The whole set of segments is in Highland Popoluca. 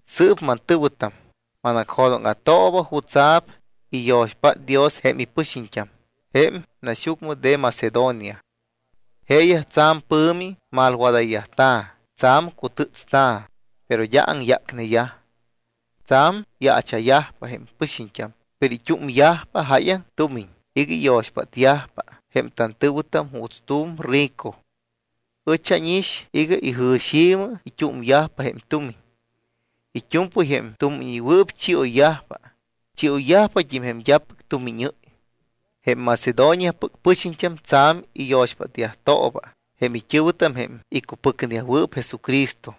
Sɨɨp, mantɨ̱wɨtam, manacjo̱dóŋa̱tooba jutsa̱p iyo̱xpát Dios jém ipɨxiñt́am jém naxyucmɨ de Macedonia. Jeeyaj tsa̱m pɨ̱mi malwadayyajta̱, tsa̱m cutɨ́tsta̱, pero d́a aŋyácneyaj. Tsa̱m yaacha̱yajpa jém pɨxiñt́am, pero it́úmyajpa jáyaŋ tumiñ iga iyo̱xpátyajpa jém tantɨ̱wɨtam juuts tu̱m rico. Ɨch ánix iga ijɨ̱xi̱mɨ it́úmyajpa jém tumiñ. It́u̱mpɨy jém tumiñɨywɨɨp chioyyajpa, chioyyajpat́im jém d́apɨc tumiñɨ́y. Jém Macedoniapɨc pɨxiñt́am tsa̱m iyo̱xpátyajtooba jém it́ɨ̱wɨtam jém icupɨcneyajwɨɨp Jesucristo.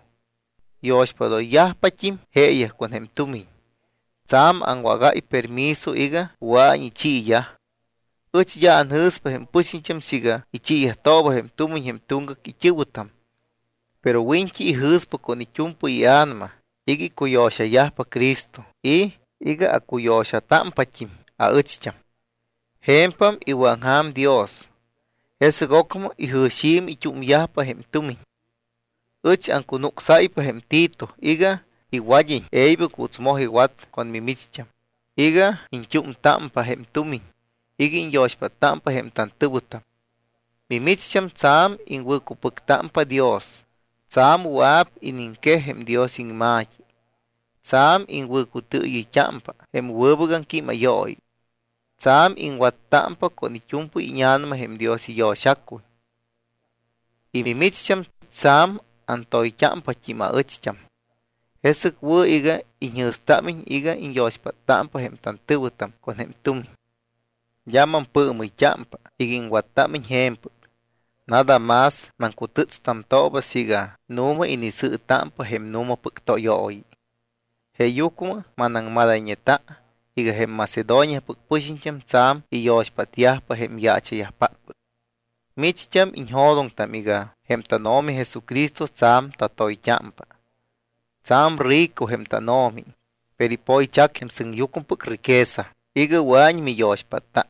Yo̱xpádoyyajpat́im jeeyaj con jém tumiñ. Tsa̱m awágáy permiso iga wɨa̱iñ ichiiyaj. Ɨch d́a anjɨ̱spa jém pɨxiñt́am siiga ichiiyajtooba jém tumiñ jém tuŋgac it́ɨ̱wɨtam. Pero wiñt́i ijɨ̱spa con it́u̱mpɨy ia̱nama iga icuyo̱xayajpa Cristo y iga acuyo̱xatámpat́im aɨcht́am. Je̱mpam iwɨ̱aŋja̱m Dios. Jesɨc ocmɨ ijɨ̱xi̱mɨ it́úmyajpa jém tumiñ. Ɨch aŋcunucsáypa jém Tito iga iwad́iñ e̱ybɨc juuts moj iwat con mimicht́am iga iñt́úmtámpa jém tumiñ iga iñyo̱xpáttámpa jém tantɨ̱wɨtam. Mimicht́am tsa̱m iŋwɨ̱cupɨctámpa Dios, tsa̱m wɨa̱p iniŋquej jém Dios iŋma̱t́i, tsa̱m iŋwɨ̱cutɨɨyɨyt́ámpa jém wɨbɨc aŋquímayooyi, tsa̱m iŋwattámpa con it́u̱mpɨy íña̱nama jém Dios iyo̱xacuy, y mimicht́am tsa̱m antoyt́ámpat́im aɨcht́am. Jesɨc wɨ̱ iga iñjɨ̱stámiñ iga iñyo̱xpáttámpa jém tantɨ̱wɨtam con jém tumiñ. D́a mampɨɨmɨyt́ámpa iga iŋwattámiñ je̱mpɨc, nada más maŋcutɨ́tstamtooba siiga nu̱ma inisɨɨtámpa jém nu̱mapɨc tóyooyi. Jeeyucmɨ manaŋmadayñeta iga jém Macedoniapɨc pɨxiñt́am tsa̱m iyo̱xpátyajpa jém yaacha̱yajpáppɨc. Micht́am iñjo̱doŋtam iga jém tánO̱mi Jesucristo tsa̱m tatoyt́ámpa. Tsa̱m rico jém tánO̱mi, pero ipoychac jém sɨŋyucmɨpɨc riqueza iga wɨa̱iñ miyo̱xpátta.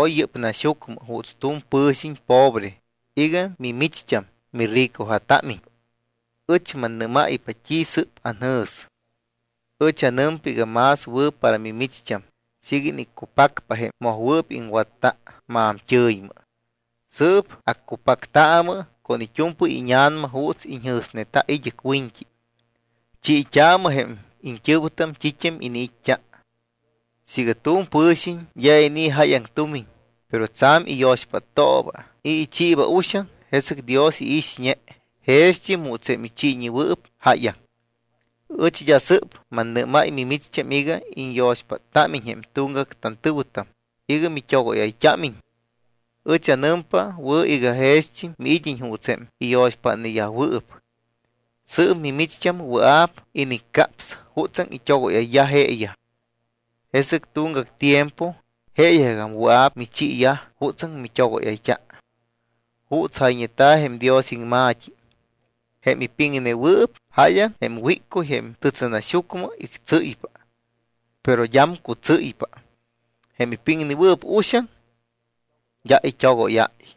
Oy yɨ́p naxyucmɨ juuts tu̱m pɨ̱xiñ pobre iga mimicht́am miricoja̱támiñ. Ɨch mannɨ́máypa t́i sɨ́p anjɨ̱s. Ɨch anɨmpa iga más wɨ̱ para mimicht́am siiga iniccupacpa jém mojwɨɨp iŋwatta maamt́ɨ̱ymɨ. Sɨɨp accupactaamɨ con it́u̱mpɨy íña̱nama juuts iñjɨ̱sneta id́ɨc wiñt́i. Chiit́aamɨ jém iñt́ɨ̱wɨtam t́it́am iniit́t́a. Siiga tu̱m pɨ̱xiñ d́a inii̱ jáyaŋ tumiñ, pero tsa̱m iyo̱xpáttooba y ichiiba uxaŋ, jesɨc Dios iixñe jext́im juuts jém ichiiñewɨɨp jáyaŋ. Ɨch d́a sɨ́p mannɨ́máy mimicht́am iga iñyo̱xpáttámiñ jém tuŋgac tantɨ̱wɨtam iga mit́ogóyayt́ámiñ. Ɨch anɨmpa wɨ̱ iga jext́im miid́iñ juuts jém iñyo̱xpátnewɨɨp. Sɨɨp mimicht́am wɨa̱p iniccaps jutsaŋ it́ogóyayyaj jeeyaj. Jesɨc tuŋgac tiempo jeeyajgagam wɨa̱p michiiyaj jutsaŋ mit́ogóyayt́a. Juuts jayñeta̱ jém Dios iŋma̱t́i: “Jém ipiŋnewɨɨp jáyaŋ jém wíccuy jém tɨtsɨnaxyucmɨ ictsɨ́ypa, pero d́am cutsɨ́ypa. Jém ipiŋnewɨɨp uxaŋ, d́a t́i it́ogóyáy.”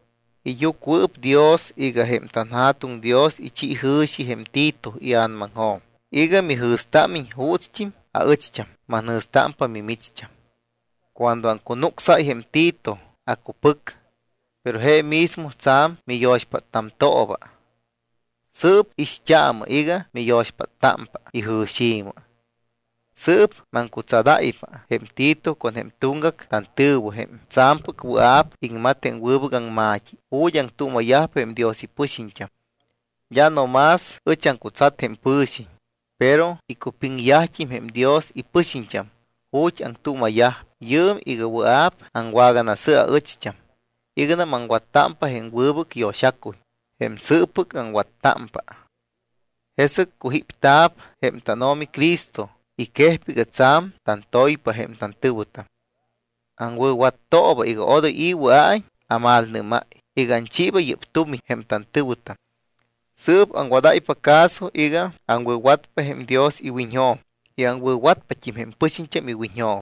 Iyucuɨpdios iga jém tanJa̱tuŋ Dios ichi jɨ̱xi jém Tito ia̱namaŋjo̱m iga mijɨ̱stámiñ juutst́im aɨcht́am manjɨ̱stámpa mimicht́am. Cuando aŋcunucsáy jém Tito, acupɨc, pero je mismo tsa̱m miyo̱xpáttamtooba, sɨɨp ixt́aamɨ iga miyo̱xpáttámpa ijɨ̱xi̱mɨ. Sɨɨp maŋcutsadáypa jém Tito con jém tuŋgac tantɨ̱wɨ jém tsa̱mpɨc wɨa̱p iŋmat jém wɨbɨc aŋma̱t́i ju̱t́ aŋtuuma̱yajpa jém Dios ipɨxiñt́am. D́a no más ɨch aŋcutsat jém pɨ̱xiñ, pero icupiŋyajt́im jém Dios ipɨxiñt́am ju̱t́ aŋtuuma̱yajpa yɨɨm iga wɨa̱p awaganasɨ aɨcht́am iganam aŋwattámpa jém wɨbɨc yo̱xacuy jém sɨɨppɨc aŋwattámpa. Jesɨc cujípta̱p jém tánO̱mi Cristo y quejpa iga tsa̱m tantoypa jém tantɨ̱wɨtam. Aŋwɨ̱wattooba iga odoy i̱ wɨa̱iñ amalnɨ́máy iga anchiiba yɨ́p tumiñ jém tantɨ̱wɨtam. Sɨɨp aŋwadáypa caso iga aŋwɨ̱watpa jém Dios iwiñjo̱m y aŋwɨ̱watpat́im jém pɨxiñt́am iwiñjo̱m.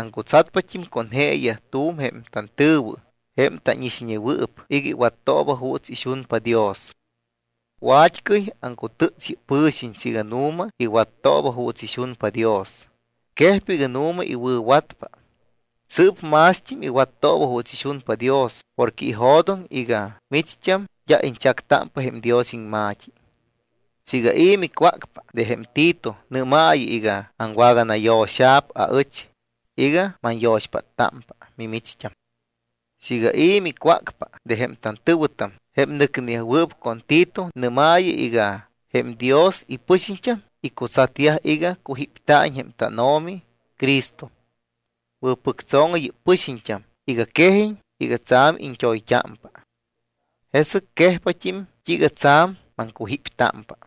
Aŋcutsatpat́im con jeeyaj tu̱m jém tantɨ̱wɨ, jém tánixñewɨɨp, iga iwattooba juuts ixunpa Dios. Wat́cɨy aŋcutɨ́ts yɨ́p pɨ̱xiñ siiga nu̱ma iwattooba juuts ixunpa Dios, quejpa iga nu̱ma iwɨ̱watpa. Sɨɨp mást́im iwattooba juuts ixunpa Dios porque ijo̱doŋ iga micht́am d́a iñchactámpa jém Dios iŋma̱t́i. Siiga i̱ micwácpa de jém Tito, nɨ́maayɨ iga awaganayo̱xa̱p aɨch iga manyo̱xpáttámpa mimicht́am. Siiga i̱ micwácpa de jém tantɨ̱wɨtam, jém nɨcneyajwɨɨp con Tito, nɨ́maayɨ iga jém Dios ipɨxiñt́am icutsatyaj iga cujípta̱iñ jém tánO̱mi Cristo. Wɨ̱pɨctso̱ŋɨ yɨ́p pɨxiñt́am iga quejiñ iga tsa̱m iñt́oyt́ámpa. Jesɨc quejpat́im t́iiga tsa̱m maŋcujíptámpa.